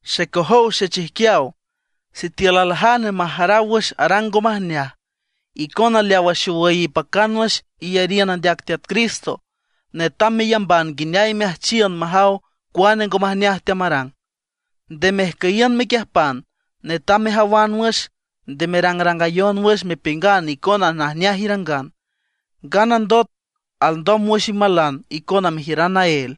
Xecojow xechijquiaw, sitiül aljane majaraw wüx arang ngo majneaj, icona leawa xowüy ipacan wüx iyariün andeac Teat Cristo netam meyamban nguineay meajchiün majaw cuane ngo majneaj teamarang, nde mejcüyiün mequiüjpan. Netam mejawan wüx, nde merangrangayon wüx mepiüngan icona najneaj irangan, nganandot alndom wüx imalan icona mejiüran naél.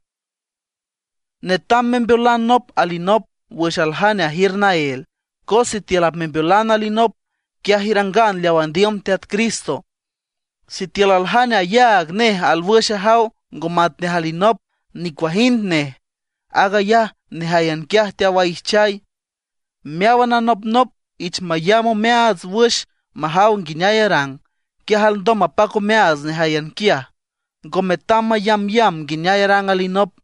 Netam membeolan nop alinop wüx aljane ajiür naél, cos sitiül apmembeolan alinop, quiaj irangan leaw andiüm Teat Cristo. Sitiül aljane ayaag nej alwüx ajaw ngo matnej alinop, nicuajind nej, aag ayaj nejáyan quiaj teawaijchay. Meáwan anopnop ich mayamb omeaats wüx majaw nguineay arang, quiaj alndom mapac omeaats nejáyan quiaj, ngo metam mayambyamb nguineay arang alinop.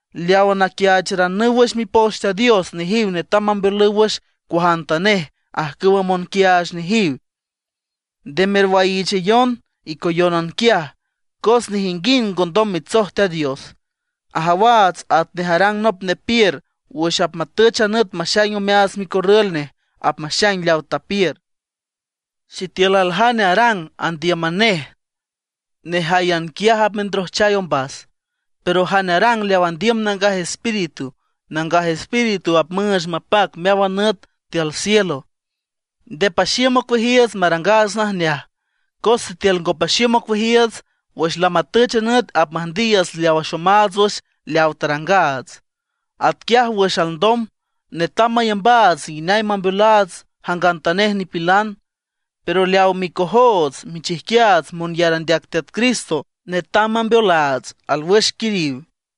Leawa naquiaacharanüw wüx Mipoch Teat Dios, nejiw netam mambeolüw wüx cuajantanej ajcüwa monquiaach nejiw. Nde merwaiichayon icoyónan quiaj, cos nejinguind ngondom mitsoj Teat Dios. Ajawaats atnej arang nop nepiür wüx apmatüch a nüt maxaing omeaats micorrül nej, apmaxaing leaw tapiür. Sitiül aljane arang andíüman nej, nejáyan quiaj apmendrojchay ombas. Pero jane arang leaw andiüm Nangaj Espíritu, Nangaj Espíritu apmüüch mapac meáwan nüt tiül cielo. Nde paxiüm ocueajiiüts marangaats najneaj. Cos sitiül ngo paxiüm ocueajiiüts, wüx lamatüch a nüt apmüjndiiüts leaw axomaats wüx leaw tarangaats. Atquiaj wüx alndom, netam mayambaats nguineay mambeolaats jangantanej nipilan; pero leaw micojoots michijquiaats monyar andeac Teat Cristo, netam mambeolaats alwüx quiriw.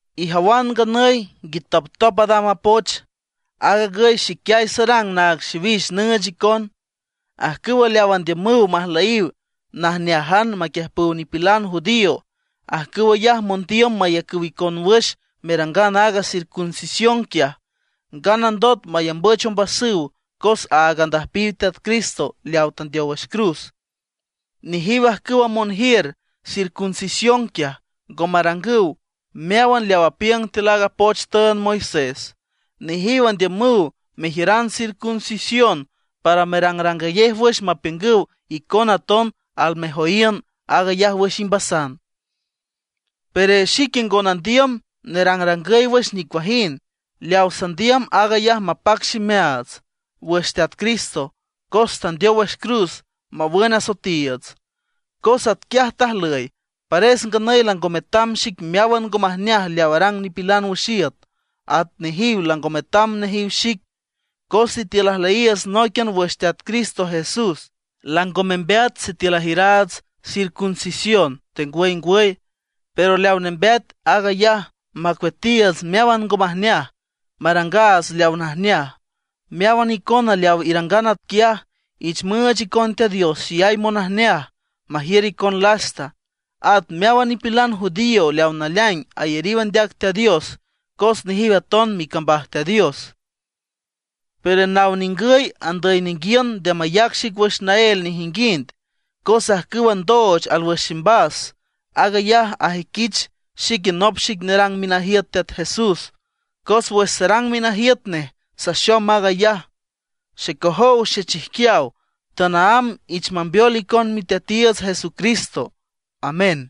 Ijawan nganüy nguitoptop adam a poch. Aag agüy xiquiay sarang naag xiwix nüüch icon. Ajcüw leawa andiümüw majlüyiw najnéajan maquiüjpüw nipilan judío, ajcüw ayaj mondiüm mayacüw icon wüx merangan aaga circuncisión quiaj, nganandot mayambüch ombasüw cos áag andüjpiw Teat Cristo leawa tandeow wüx cruz. Nejiw ajcüwa monjiür circuncisión quiaj, ngo marangüw meáwan leaw apiüng tiül a poch tüünd Moisés; nejiw andiümüw mejiüran circuncisión para merangrangayej wüx mapiüngüw icona aton almejoyiün aag ayaj wüx imbasan. Pero xique ngo nandiüm nerangrangüy wüx nicuajind. Leaw sandiüm, aag ayaj mapac ximeaats wüx Teat Cristo cos tandeow wüx cruz mawün asoetiiüts. Cos atquiaj tajlüy, pares nganüy lango metam xic meáwan ngo majneaj leaw arang nipilan wüx iüt, at nejiw lango metam nejiw xic. Cos sitiül ajlüyiiüts nóiquian wüx Teat Cristo Jesús, lango membeat sitiül ajiüraats circuncisión tengwüy ngwüy. Pero leaw nembeat aag ayaj macueatiiüts meáwan ngo majneaj, marangaats leaw najneaj. Meáwan icona leaw irangan atquiaj, ich müüch icon Teat Dios xeyay monajneaj, majiür icon lasta, at meáwan nipilan judío leaw naleaing ayariw andeac Teat Dios, cos nejiw aton micambaj Teat Dios. Pero naw ningüy andüy ninguiün nde mayac xic wüx naél nejinguind. Cos ajcüwa ndooch alwüx ximbas, aag ayaj ajüiquich xique nop xic nerang minajiüt Teat Jesús, cos wüx sarang minajiüt nej saxom aag ayaj. Xecojow xechijquiaw, tanaámb ich mambeol icon Miteatiiüts Jesucristo. Amén.